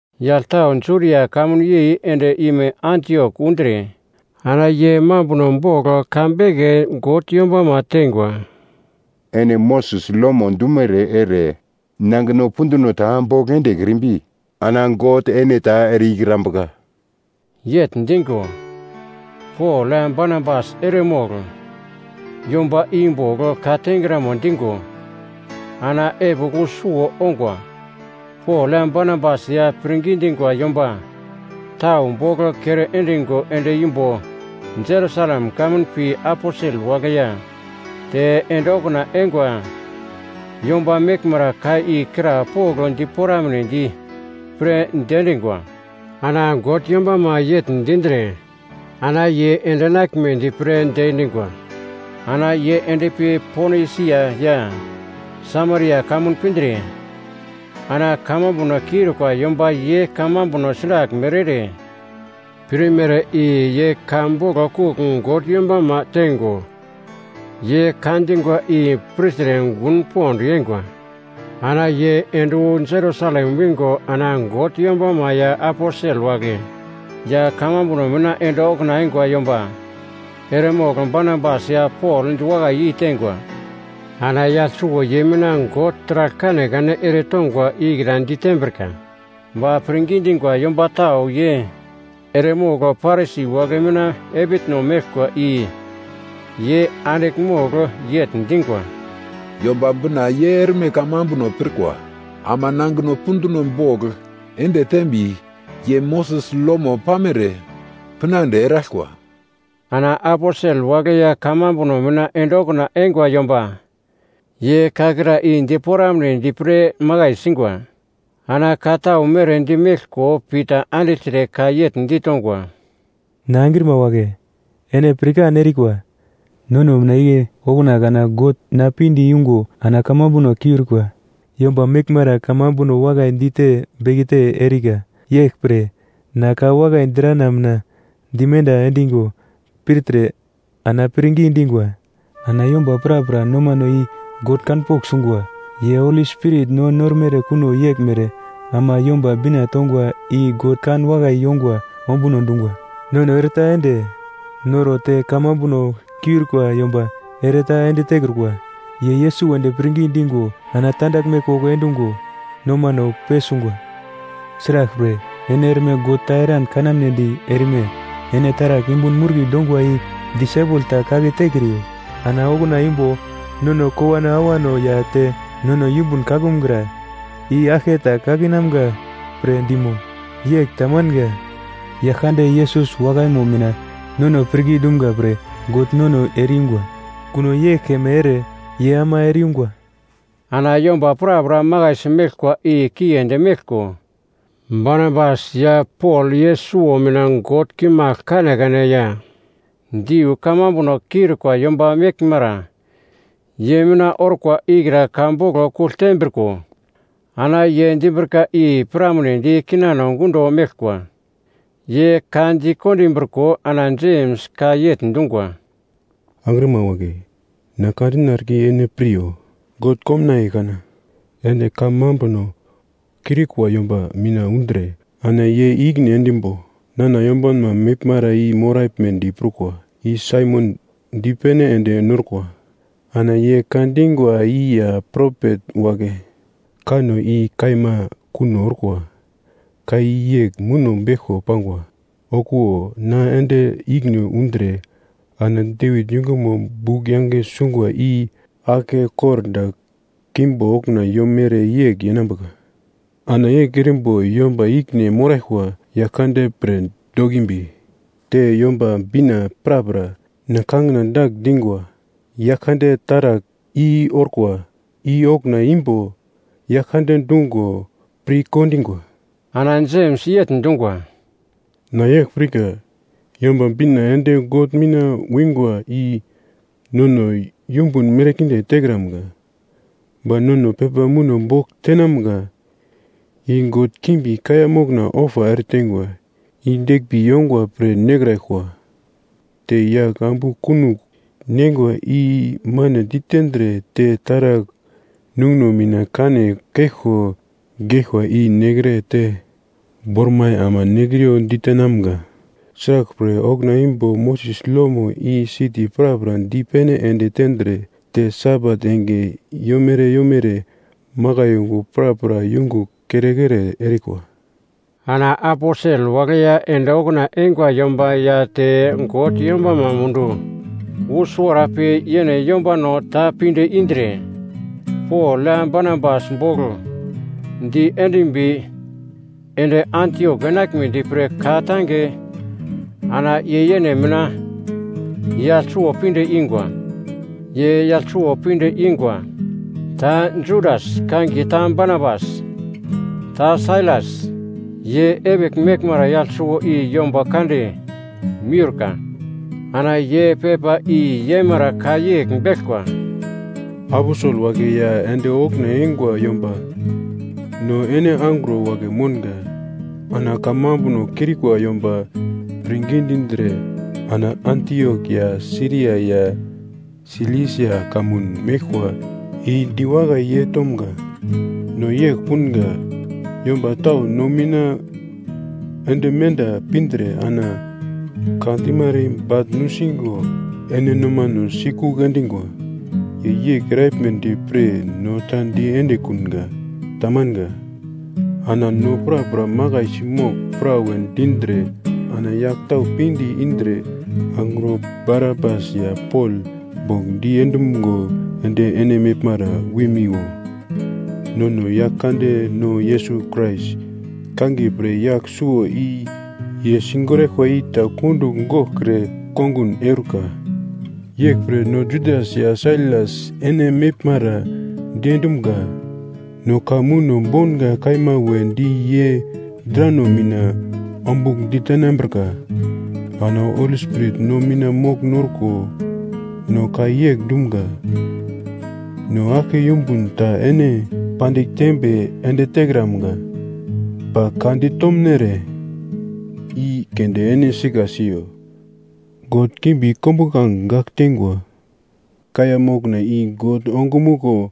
Yagl tau Judia kamun yei ende ime Antiok undre, ana ye mambuno bogl ka beke God yombama teingwa, “Ene Moses lomo dumere ere nangino punduno ta bogl endekrimbi, ana God ene ta ere-ikrambuka.” Yegl dingo, Pol ya Barnabas eremogl yomba i bogl ka tengramo dingo ana epigl wu suwo ongwa. Pol ya Barnabas ya pirngi dingwa yomba tau bogl kere endingo ende imbo Jerusalem kamun pi aposel wagle ya te ende okuna eingwa yomba meglmara ka i krapogl diporamnedi pre diendingwa. Ana God yombama yegl dindre, ana ye ende enaglmedi pre diendingwa. Ana ye endpi Ponisia ya Samaria kamun pindre, ana kamambuno kiurikwa yomba ye kamambuno sraglmere ere pirmere i ye ka boglo kugl God yombama teingo ye ka dingwa i pirtre gun pond yeingwa. Ana ye ende wu Jerusalem wingo ana God yombama ya aposel wagle ya kamambuno mina ende okuna eingwa yomba eremogl Barnabas ya Pol diwakai yeiteingwa. Ana yagl suwo ye mina God taragl kanekane eretongwa ikra ditembrika. Ba pirngi dingwa yomba tau ye eremogl Parisi wagle mina epitno meglkwa i ye andigl mogl yegl dingwa, “Yomba Bina ye erme kamambuno pirkwa ama nangino punduno bogl ende teimbi, ye Moses lomo pamere pinande eraglkwa.” Ana aposel wagle ya kamambuno mina ende okuna eingwa yomba ye ka kra i diporamnedi pre makai singwa. Ana ka tau mere dimeglko Pita andigltre ka yegl ditongwa, “Na angrima wagle, ene pirkan erikwa, nono mina igle okuna kana God na pinde yungo ana kamambuno kiurikwa yomba meglmara kamambuno wakai dite bekete erikra. Yeglpre na ka wakai drana mina dimenda endingo pirtre ana pirngi dingwa. Ana yomba prapra nomano i God kanpogl sungwa, ye Holi Spirit no normere kuno yeglmere, ama Yomba Bina tongwa i God kan wakai yongwa ombuno dungwa. Nono ere-ta ende noro te kamambuno kiurikwa yomba ere-ta ende tekrukwa. Ye Yesus wedi pirngi digo ana tandaglme koko endungo nomano pesungwa. Sraglpre ene erme God ta eran kanamnedi erme? Ene taragl yumbun murki dongwa i disaipel ta kake tekriyo. Ana okuna imbo nono kowano awano ya te nono yumbun kakumgra, i aglketa kakinamga pre dimo? Yegl tamanga, Yaglkande Yesus wakaimo mina nono pirngi dumga pre God nono ere-yungwa, kuno yegl keme ere ye ama ere-yungwa.” Ana yomba prapra makaisi meglkwa i kiendi meglko, Barnabas ya Pol ye suwo mina God kimagl kanekane ya diu kamambuno kiurikwa yomba meglmara ye mina orkwa ikra ka boglo kugl tembriko, ana ye dimbrika i piramnedi kinano gundo meglkwa. Ye ka dikondimbriko ana Jems ka yegl dungwa, “Angrima wagle, na ka dina erika i ene piryo. God komnaiye kana ende kamambuno kiurikwa yomba mina undre ana ye i-ikine endimbo nana yombanma meglmara i moraglmedi prukwa, i Saimon dipene ende norkwa. Ana ye ka dingwa i ya propet wagle kanno i kaima kuno orkwa. Ka i yegl muno beglko pangwa: “‘Okuwo na ende ikine undre ana Devit yungumo bugl yange sungwa i aglke kordagl keimbo okuna yomere yegl yeinambuka. Ana yegl erimbo yomba ikine moraglkwa Yaglkande pre dokimbi, te Yomba Bina prapra na kangina dagl dingwa, Yaglkande taragl i orkwa,’ i okuna imbo Yaglkande dungo pirkondingwa. Ana Jems yegl dungwa, “Na yegl pirka: Yomba Bina ende God mina wingwa i nono yumbun merkinde tekramga. Ba nono pepa muno bogl tenamga. I god kimbi kaiya mokna ofa ereteingwa i deglmbi yongwa pre nekraglkwa te yagl ambu kunogl neingwa i mane ditendre te taragl nunguno mina kane keglko geglkwa i nekre te bormai ama nekriyo ditenamga. Sraglpre okuna imbo Moses lomo i siti prapra dipene ende tendre, te Sabat enge yomere yomere makai yungu prapra yungugl kere-kere erikwa.” Ana aposel wagle ya ende okuna eingwa yomba ya te God yombama mundu, wu suwara pi yene yombano ta pinde indre, Pol ya Barnabas bogl diendimbi ende Antiok enaglmedi pre ka-tange ana ye yene mina yagl suwo pinde ingwa. Ye yagl suwo pinde ingwa, ta Judas (kangiye ta Barsabas) ta Sailas. Ye epigl meglmara yagl suwo i yomba kande miurka. Ana ye pepa i-yemara ka yegl beglkwa: Aposel wagle ya ende okuna eingwa yomba no ene angro wagle mounga, ana kamambuno kiurikwa yomba pirngi dindre ana Antiok ya Siria ya Silisia kamun meglkwa i diwakai yeitomga. No yegl punga, yomba tau no mina ende menda pindre ana ka dimara i bagl nusingo ene nomano sikugl endingwa. Ye yegl eraglmedi pre no ta diendekunga. Tamanga. Ana no prapra makaisi mogl, prawe dindre ana yagl tau pinde indre, angro Barnabas ya Pol bogl diendumgo ende ene meglmara wimiwo. Nono Yaglkandeno Yesus Krais kangiye pre yagl suwo i ye sigoraglkwa i ta kundugl goglkre kongun eurika. Yeglpre no Judas ya Sailas ene meglmara diendumga. No ka muno bounga kaima wedi ye drano mina ombugl ditenambrika. Ana Holi Spirit no mina mogl norko no ka yegl dumga, no aglke yumbun ta ene pandigl tembe ende tekramga. Ba ka ditomnere i keunde ene sika siyo. God kimbi kombuglange gagl teingwa kaiya mokna i God ongumuglo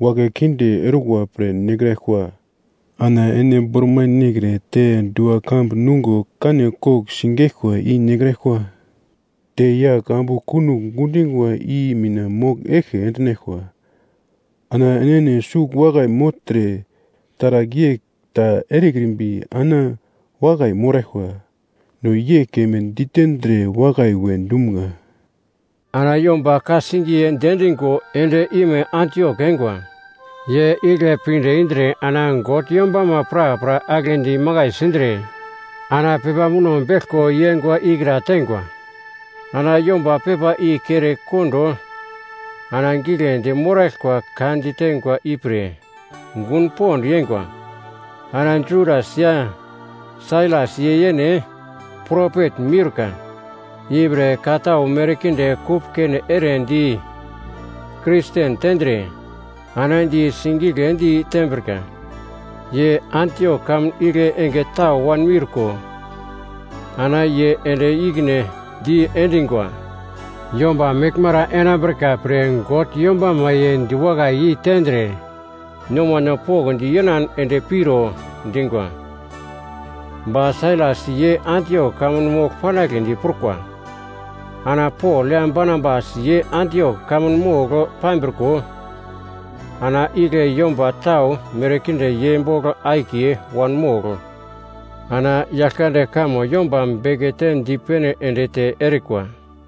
wagle kinde orkwa pre nekraglkwa. Ana ene bormai nekre te dua-kambu nungo kane kogl sigeglkwa i nekraglkwa. Te yagl ambu kunogl gundingwa i mina mogl eglke endinaglkwa. Ana enene sugl wakai mogltre, taragl yegl ta erekrimbi ana wakai moraglkwa. No yegl keme ditendre, wakai we dumga. Ana yomba ka-singiye diendingo ende ime Antiok eingwa. Ye igle pindre ana God yombama prapra aglendi imakai sindre ana pepa muno beglko i-eingwa ikra teingwa. Ana yomba pepa i kere kondo ana giglendi moraglkwa ka diteingwa ipre gun pond yeingwa. Ana Judas ya Sailas ye yene propet miurka, ipre ka tau merkinde kupkene ere di Kristen tendre, ana di sigigledi tembrika. Ye Antiok kamun igle enge tau wanmiurko ana ye ende ikine diendingwa yomba meglmara enambrika pre God yombama ye diwakai yeitendre, nomano pokndi yenan ende piro dingwa. Ba Sailas ye Antiok kamun mogl panagledi prukwa. Ana Pol ya Barnabas ye Antiok kamun mogl pambriko, ana igle yomba tau merkinde ye bogl akiye wanmogl, ana Yaglkande kamo yomba bekete dipene ende te erikwa.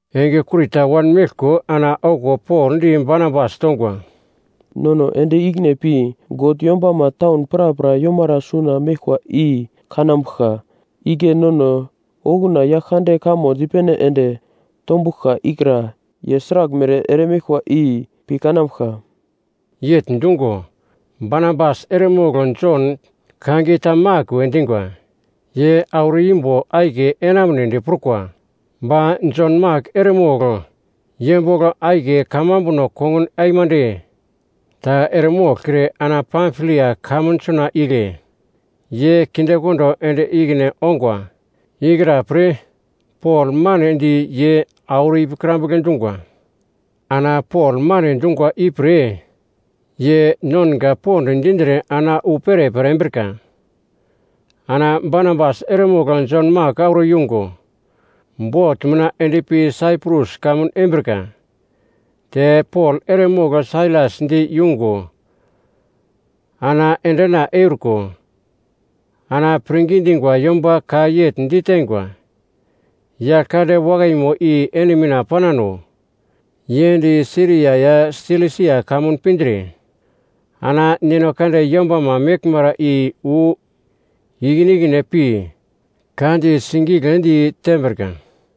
Enge kurita wanmeglko ana okuwo Pol di Barnabas tongwa, “Nono ende ikine pi God yombama taun prapra yomara suna meglkwa i kanambuglka, igle nono okuna Yaglkande kamo dipene ende tombuglka ikra, ye sraglmere ere meglkwa i pi kanambuglka.” Yegl dungo, Barnabas eremogl Jon kangiye ta Mak we dingwa, ye auro imbo akiye enamunedi prukwa. Ba Jon Mak eremogl ye bogl akiye kamambuno kongun aimande ta eremoglkre ana Pamfilia kamun suna igle ye kindekondo ende ikine ongwa ikra-pre, Pol manedi ye auro ipikrambugle dungwa. Ana Pol mane dungwa ipre ye nonga pond dindre ana wu perepere embrika. Ana Barnabas eremogl Jon Mak auro yungo, bot mina endpi Saiprus kamun embrika. Te Pol eremogl Sailas di yungo ana endena euriko, ana pirngi dingwa yomba ka yegl diteingwa, “Yaglkande wakaimo i ene mina panano.” Ye ende Siria ya Silisia kamun pindre ana God yombama meglmara i wu ikine ikine pi, ka di sigigledi tembrika.